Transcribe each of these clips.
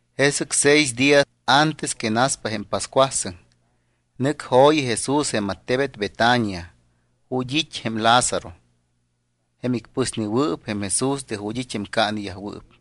Jesɨc seis día antes que naspa jém pascuasɨŋ, nɨc jo̱yi Jesús jém attebet Betania ju̱t́ it́ jém Lázaro, jém icpɨsnewɨɨp jém Jesús de ju̱t́ it́ jém caaneyajwɨɨp.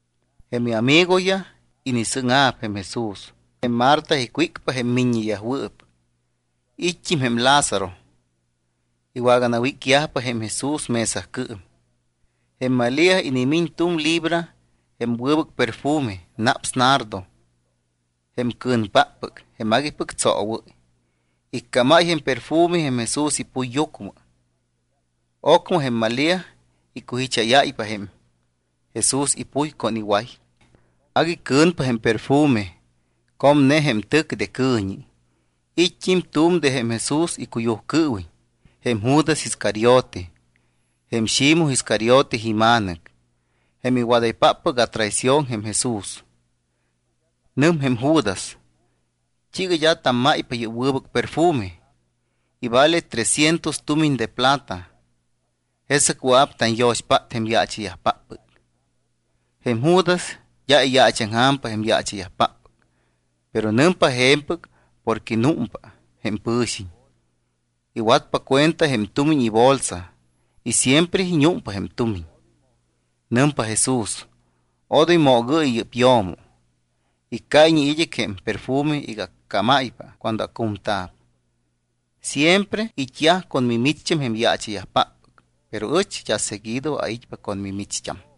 Jém iamigoyaj inisɨ́ŋa̱p jém Jesús. Jém Marta icwícpa jém miññeyajwɨɨp. It́t́im jém Lázaro. Iwaganawícyajpa jém Jesús mesacɨɨm. Jém Malía inimiñ tu̱m libra jém wɨbɨc perfume, naps nardo, jém cɨ̱npáppɨc, jém aguipɨc tsoowɨ́y. Iccámáy jém perfume jém Jesús ipuyyucmɨ. Ocmɨ jém Malía icujicháyáypa jém Jesús ipuy con iway. Agui cɨ̱npa jém perfume, comne jém tɨc de cɨ̱ñi. It́t́im tu̱m de jém Jesús icuyujcɨɨwiñ, jém Judas Iscariote, jém Ximoj Iscariote ima̱nɨc, jém iwadaypáppɨc atraición jém Jesús. Nɨm jém Judas: —¿T́iiga d́a tammáypa yɨ́p wɨbɨc perfume? Ivale tres cientos tumiñ de plata. Jesɨc wɨa̱p tanyo̱xpát jém yaacha̱yajpáppɨc. Jém Judas d́a iyaachaŋja̱mpa jém yaacha̱yajpáppɨc, pero nɨmpa je̱mpɨc porque númpa jém pɨ̱xiñ. Iwatpa cuenta jém tumiñ ibolsa y siempre iñúmpa jém tumiñ. Nɨmpa Jesús: —Odoy moogɨɨyɨ yɨ́p yo̱mo. Iccáyñe id́ɨc jém perfume iga accámáypa cuando acu̱mta̱p. Siempre it́yaj con mimicht́am jém yaacha̱yajpáppɨc, pero ɨch d́a seguido ait́pa con mimicht́am.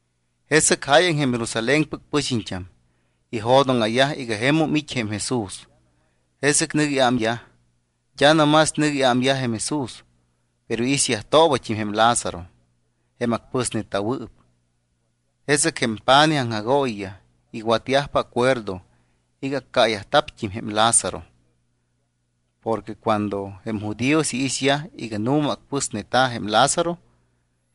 Jesɨc jáyaŋ jém Jerusalénpɨc pɨxiñt́am ijo̱dóŋa̱yaj iga jemum it́ jém Jesús. Jesɨc nɨc iámyaj. D́a no más nɨc iámyaj jém Jesús, pero iixyajtoobat́im jém Lázaro jém acpɨsneta̱wɨɨp. Jesɨc jém pa̱nij aŋjagooyiyaj iwatyajpa acuerdo iga iccaayajpat́im jém Lázaro. Porque cuando jém judíos iixyaj iga nu̱ma acpɨsneta̱ jém Lázaro,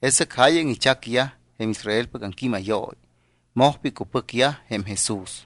jesɨc jáyaŋ ichacyajpa jém Israelpɨc aŋquímayooyi, mojpa icupɨcyaj jém Jesús.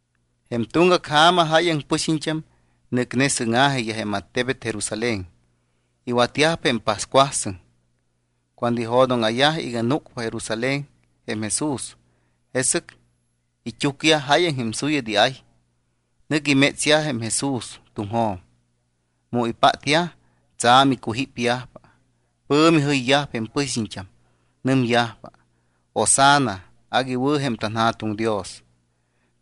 Jém tuŋgac ja̱ma jáyaŋ pɨxiñt́am nɨcne sɨ́ŋa̱jiyaj jém attebet Jerusalén. Iwatyajpa jém pascuasɨŋ. Cuando ijo̱dóŋa̱yaj iga núcpa Jerusalén jém Jesús, jesɨc it́úcyaj jáyaŋ jém suyat iay. Nɨc imétsyaj jém Jesús tuŋjo̱m. Mu ipátyaj, tsa̱m icujípyajpa. Pɨ̱mi jɨyyajpa jém pɨxiñt́am. Nɨmyajpa: —¡Hosanna! ¡Agui wɨ̱ jém tanJa̱tuŋ Dios!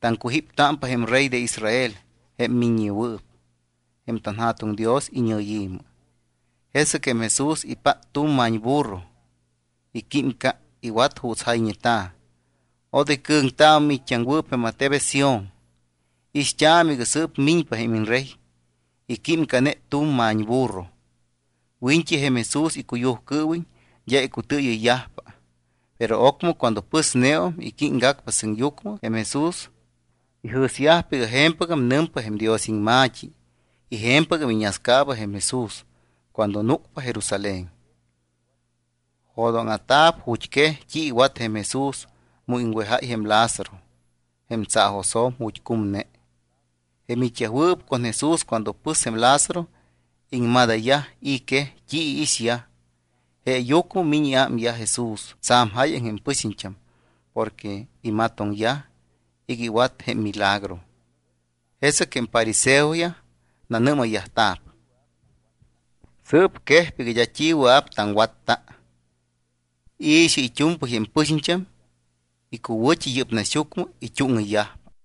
¡Taŋcujíptámpa jém Rey de Israel jém miññewɨɨp jém tanJa̱tuŋ Dios iñɨyi̱mɨ! Jesɨc jém Jesús ipát tu̱m ma̱ñburro. Iquímca. Iwat juuts jayñeta̱: Odoy cɨ̱ŋtaamɨ miit́t́aŋwɨɨp jém attebet Sión. Ixt́aamɨ iga sɨɨp miñpa jém iñRey. Iquímcane tu̱m ma̱ñburro. Wiñt́i jém Jesús icuyujcɨɨwiñ d́a icutɨɨyɨyyajpa, pero ocmɨ cuando pɨsneum y químgac sɨŋyucmɨ jém Jesús, ijɨ̱syajpa iga je̱mpɨgam nɨmpa jém Dios iŋma̱t́i y je̱mpɨgam iñascaaba jém Jesús cuando núcpa Jerusalén. Jo̱dóŋa̱ta̱p ju̱t́quej t́i iwat jém Jesús mu iŋwejáy jém Lázaro jém tsaajosjo̱m ju̱t́ cumne. Jém it́yajwɨɨp con Jesús cuando pɨs jém Lázaro, iŋmadayyaj i̱ quej t́i iixyaj. Jeeyucmɨ miñ iámyaj Jesús tsa̱m jáyaŋ jém pɨxiñt́am porque imatoŋyaj iga iwat jém milagro. Jesɨc jém fariseoyaj nanɨ́mayyajta̱p: —Sɨɨp quejpa iga d́a t́i wɨa̱p taŋwatta. I̱xɨ, it́u̱mpɨy jém pɨxiñt́am icuwɨ̱t́i yɨ́p naxyucmɨ it́úŋɨyyajpa.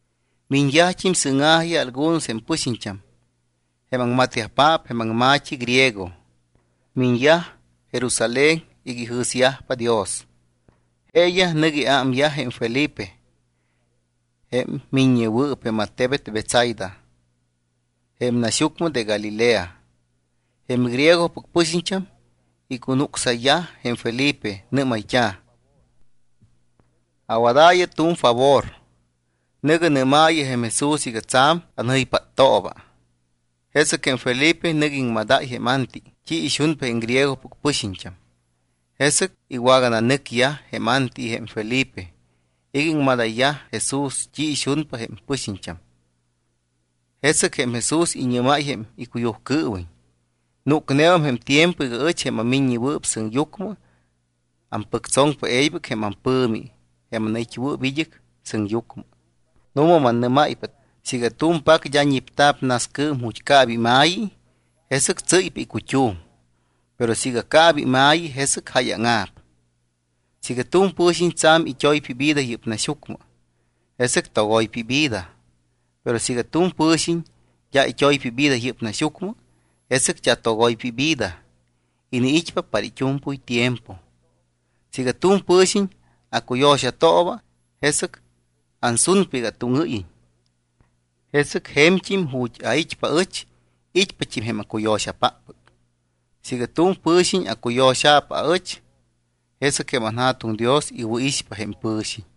Miñyajt́im sɨ́ŋa̱jiyaj algunos jém pɨxiñt́am jém aŋmatyajpaap jém aŋma̱t́i griego. Miñyaj Jerusalén iga ijɨ̱syajpa Dios. Jeeyaj nɨc iámyaj jém Felipe, jém miññewɨɨp jém attebet Betsaida jém naxyucmɨ de Galilea. Jém griegopɨc pɨxiñt́am icunucsayyaj jém Felipe. Nɨ́mayt́a̱: —Awadaayɨ tu̱m favor. Nɨ̱gɨ nɨ́maayɨ jém Jesús iga tsa̱m anjɨypáttooba. Jesɨc jém Felipe nɨc iŋmadáy jém Anti t́i ixunpa jém griegopɨc pɨxiñt́am. Jesɨc iwagananɨcyaj jém Anti y jém Felipe iga iŋmadayyaj Jesús t́i ixunpa jém pɨxiñt́am. Jesɨc jém Jesús iñɨ́máy jém icuyujcɨɨwiñ: —Núcneum jém tiempo iga ɨch, jém aMiññewɨɨp Sɨŋyucmɨ, ampɨctsoŋpa e̱ybɨc jém ampɨ̱mi jém anait́wɨɨp id́ɨc sɨŋyucmɨ. Nu̱ma mannɨ́máypa siiga tu̱m pac d́a ñipta̱p nascɨɨm ju̱t́ caaba ima̱yi, jesɨc tsɨ́ypa icut́um. Pero siiga caaba ima̱yi, jesɨc jáyaŋa̱p. Siiga tu̱m pɨ̱xiñ tsa̱m it́oypa ivida yɨ́p naxyucmɨ, jesɨc togoypa ivida. Pero siiga tu̱m pɨ̱xiñ d́a it́oypa ivida yɨ́p naxyucmɨ, jesɨc d́a togoypa ivida, iniit́pa para it́u̱mpɨy tiempo. Siiga tu̱m pɨ̱xiñ acuyo̱xatooba, jesɨc ansunpa iga atúŋɨ́yiñ, jesɨc je̱mt́im ju̱t́ ait́pa aɨch it́pat́im jém acuyo̱xapáppɨc. Siiga tu̱m pɨ̱xiñ acuyo̱xa̱p aɨch, jesɨc jém anJa̱tuŋ Dios iwɨ̱ixpa jém pɨ̱xiñ.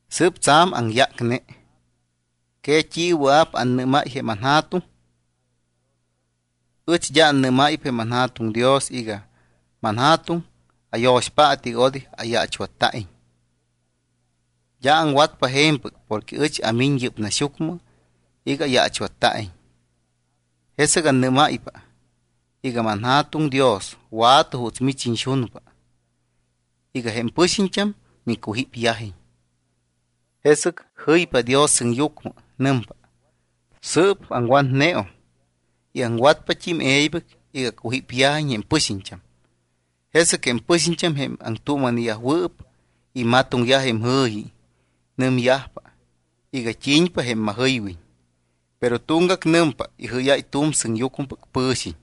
’Sɨɨp tsa̱m aŋyácne. ¿Que t́i wɨa̱p annɨ́máy jém anJa̱tuŋ? Ɨch d́a annɨ́máypa jém anJa̱tuŋ Dios iga: “ManJa̱tuŋ, ayo̱xpaatɨ iga odoy ayaachwatta̱iñ”. D́a aŋwatpa je̱mpɨc porque ɨch amiñ yɨ́p naxyucmɨ iga ayaachwatta̱iñ. Jesɨc annɨ́máypa iga: “ManJa̱tuŋ Dios, wa̱tɨ juuts mich iñxunpa iga jém pɨxiñt́am micujípyajiñ”. Jesɨc jɨypa Dios sɨŋyucmɨ. Nɨmpa: —Sɨɨp aŋwatneum y aŋwatpat́im e̱ybɨc iga acujípyajiñ jém pɨxiñt́am. Jesɨc jém pɨxiñt́am, jém aŋtuuma̱neyajwɨɨp, imatoŋyaj jém jɨ̱yi. Nɨmyajpa iga t́i̱ñpa jém majɨywiñ. Pero tuŋgac nɨmpa: —Ijɨ́yáy tu̱m sɨŋyucmɨpɨc pɨ̱xiñ.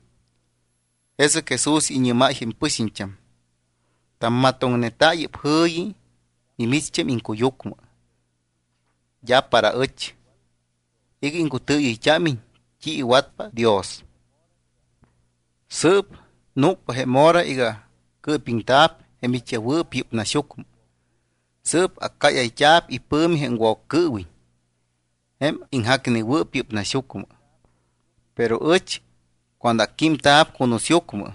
Jesɨc Jesús iñɨ́máy jém pɨxiñt́am: —Tammatoŋneta yɨ́p jɨ̱yi mimicht́am iŋcuyucmɨ, d́a para ɨch, iga iŋcutɨɨyɨyt́ámiñ t́i iwatpa Dios. Sɨɨp núcpa jém hora iga cɨɨpiŋta̱p jém it́yajwɨɨp yɨ́p naxyucmɨ. Sɨɨp accáyayt́a̱p ipɨ̱mi jém Woccɨɨwiñ, jém iŋjacnewɨɨp yɨ́p naxyucmɨ. Pero ɨch cuando acquímta̱p cunusyucmɨ,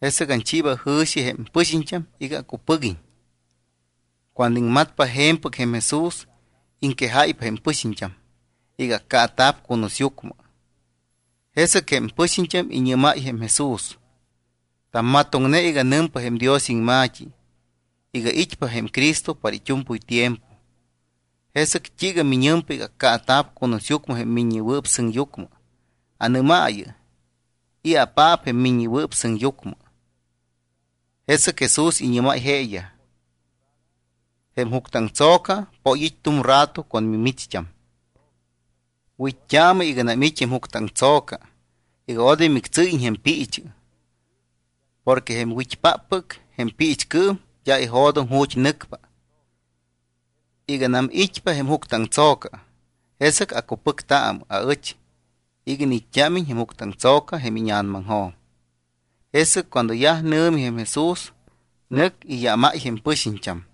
jesɨc anchiiba jɨ̱xi jém pɨxiñt́am iga acupɨguiñ. Cuando iŋmatpa je̱mpɨc jém Jesús, iŋquejáypa jém pɨxiñt́am iga accaata̱p cunusyucmɨ. Jesɨc jém pɨxiñt́am iñɨ́mayyaj jém Jesús: —Tammatoŋne iga nɨmpa jém Dios iŋma̱t́i iga it́pa jém Cristo para it́u̱mpɨy tiempo. ¿Jesɨc t́iiga miñɨmpa iga accaata̱p cunusyucmɨ jém Miññewɨɨp Sɨŋyucmɨ? Anɨ́maayɨ: ¿I̱apaap jém Miññewɨɨp Sɨŋyucmɨ? Jesɨc Jesús iñɨ́máypa jeeyaj: —Jém juctɨaŋtso̱ca poy it́ tu̱m rato con mimicht́am. Wit́t́aamɨ iganam it́ jém juctɨaŋtso̱ca iga odoy mictsɨ́yiñ jém piichɨ. Porque jém wit́páppɨc jém piichcɨɨm d́a ijo̱doŋ ju̱t́ nɨcpa. Iganam it́pa jém juctɨaŋtso̱ca, jesɨc acupɨctaamɨ aɨch iga iniit́t́ámiñt́im jém juctɨaŋtso̱ca jém íña̱namaŋjo̱m. Jesɨc cuando yaj nɨ̱mi jém Jesús, nɨc iyámáy jém pɨxiñt́am.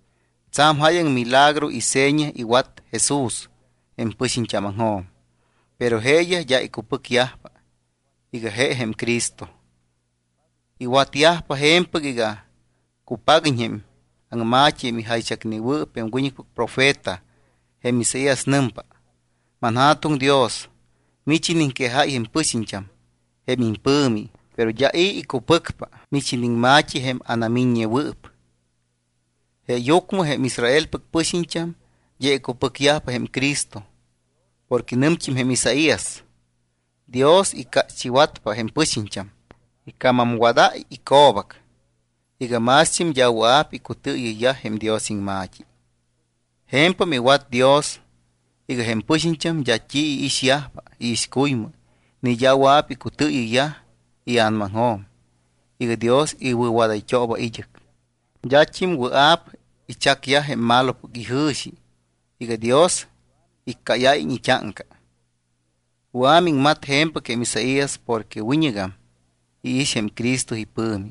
Tsa̱m jáyaŋ milagro y seña iwat Jesús jém pɨxiñt́ámaŋjo̱m, pero jeeyaj d́a icupɨcyajpa iga je jém Cristo. Iwatyajpa je̱mpɨc iga cupaguiñ jém aŋma̱t́i jém ijaychacnewɨɨp jém wiñɨcpɨc profeta jém Isaías. Nɨmpa: ManJa̱tuŋ Dios, mich iniŋquejáy jém pɨxiñt́am jém impɨ̱mi, pero d́a i̱ icupɨcpa mich iniŋma̱t́i jém anamiññewɨɨp. Jeeyucmɨ jém Israelpɨc pɨxiñt́am d́a icupɨcyajpa jém Cristo, porque nɨmt́im jém Isaías: Dios icácht́iwatpa jém pɨxiñt́am, ica̱mamwadáy ico̱bac iga mást́im d́a wɨa̱p icutɨɨyɨyyaj jém Dios iŋma̱t́i. Je̱mpam iwat Dios iga jém pɨxiñt́am d́a t́i iixyajpa iixcuymɨ ni d́a wɨa̱p icutɨɨyɨyyaj ia̱namaŋjo̱m iga Dios iwɨ̱wadayt́ooba id́ɨc. D́at́im wɨa̱p ichacyaj jém malopɨc ijɨ̱xi iga Dios iccáyáyiñ it́áŋca. Wɨa̱ iŋmat je̱mpɨc jém Isaías porque wiñɨgam iix jém Cristo ipɨ̱mi.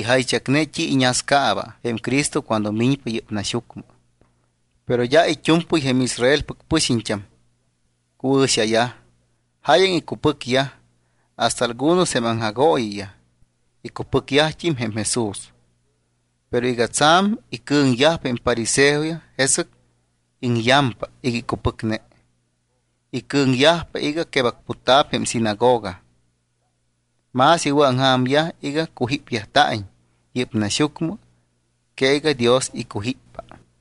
Ijaychacne t́i iñascaaba jém Cristo cuando miñpa yɨ́p naxyucmɨ. Pero d́a it́u̱mpɨy jém Israelpɨc pɨxiñt́am cuɨ̱xayaj. Jáyaŋ icupɨcyaj, hasta algunos jém aŋjagooyiyaj icupɨcyajt́im jém Jesús. Pero iga tsa̱m icɨ̱ŋyajpa jém fariseoyaj jesɨc iŋyampa iga icupɨcne. Icɨ̱ŋyajpa iga quebacputyajta̱p jém sinagoga. Más iwɨ̱aŋja̱myaj iga cujípyajta̱iñ yɨ́p naxyucmɨ que iga Dios icujíppa.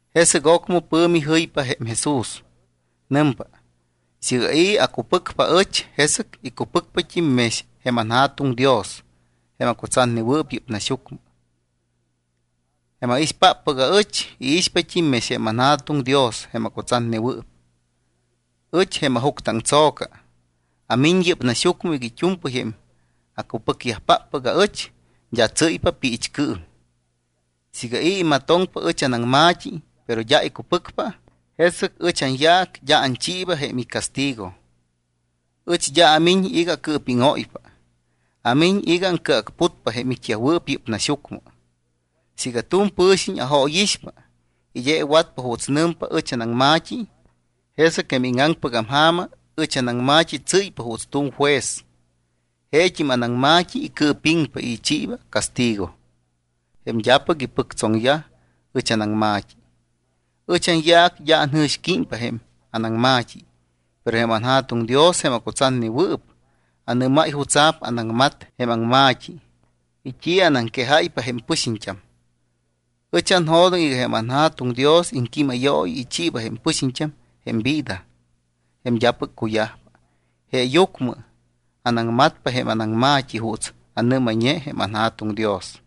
Jesɨc ocmɨ pɨ̱mi jɨypa jém Jesús. Nɨmpa: —Siiga i̱ acupɨcpa aɨch, jesɨc icupɨcpat́im mex jém anJa̱tuŋ Dios jém acutsatnewɨɨp yɨ́p naxyucmɨ. Jém aixpáppɨc aɨch, iixpat́im mex jém anJa̱tuŋ Dios jém acutsatnewɨɨp. Ɨch, jém ajuctɨaŋtso̱ca, amiñ yɨ́p naxyucmɨ iga it́u̱mpɨy jém acupɨcyajpáppɨc aɨch, d́a tsɨ́yyajpa piichcɨɨm. Siiga i̱ imatoŋpa ɨch anaŋma̱t́i, pero d́a icupɨcpa, jesɨc ɨch anyaac d́a anchiiba jém icastigo. Ɨch d́a amiñ iga acɨɨpíŋóypa. Amiñ iga aŋcɨacputpa jém it́yajwɨɨp yɨ́p naxyucmɨ. Siiga tu̱m pɨ̱xiñ ajóyixpa y d́a iwatpa juuts nɨmpa ɨch anaŋma̱t́i, jesɨc jém íŋaŋpɨgam ja̱ma ɨch anaŋma̱t́i tsɨ́ypa juuts tu̱m juez. Jeet́im anaŋma̱t́i icɨɨpiŋpa y ichiiba castigo jém d́apɨc ipɨctsoŋpa ɨch anaŋma̱t́i. Ɨch anyaac d́a anjɨ̱xquímpa jém anaŋma̱t́i, pero jém anJa̱tuŋ Dios jém acutsatnewɨɨp anɨ́máy jutsa̱p anaŋmat jém aŋma̱t́i y t́i anaŋquejáypa jém pɨxiñt́am. Ɨch anjo̱doŋ iga jém anJa̱tuŋ Dios iŋquímayooyi ichiiba jém pɨxiñt́am jém vida jém d́apɨc cuyajpa. Jeeyucmɨ anaŋmatpa jém anaŋma̱t́i juuts anɨ́mayñe jém anJa̱tuŋ Dios.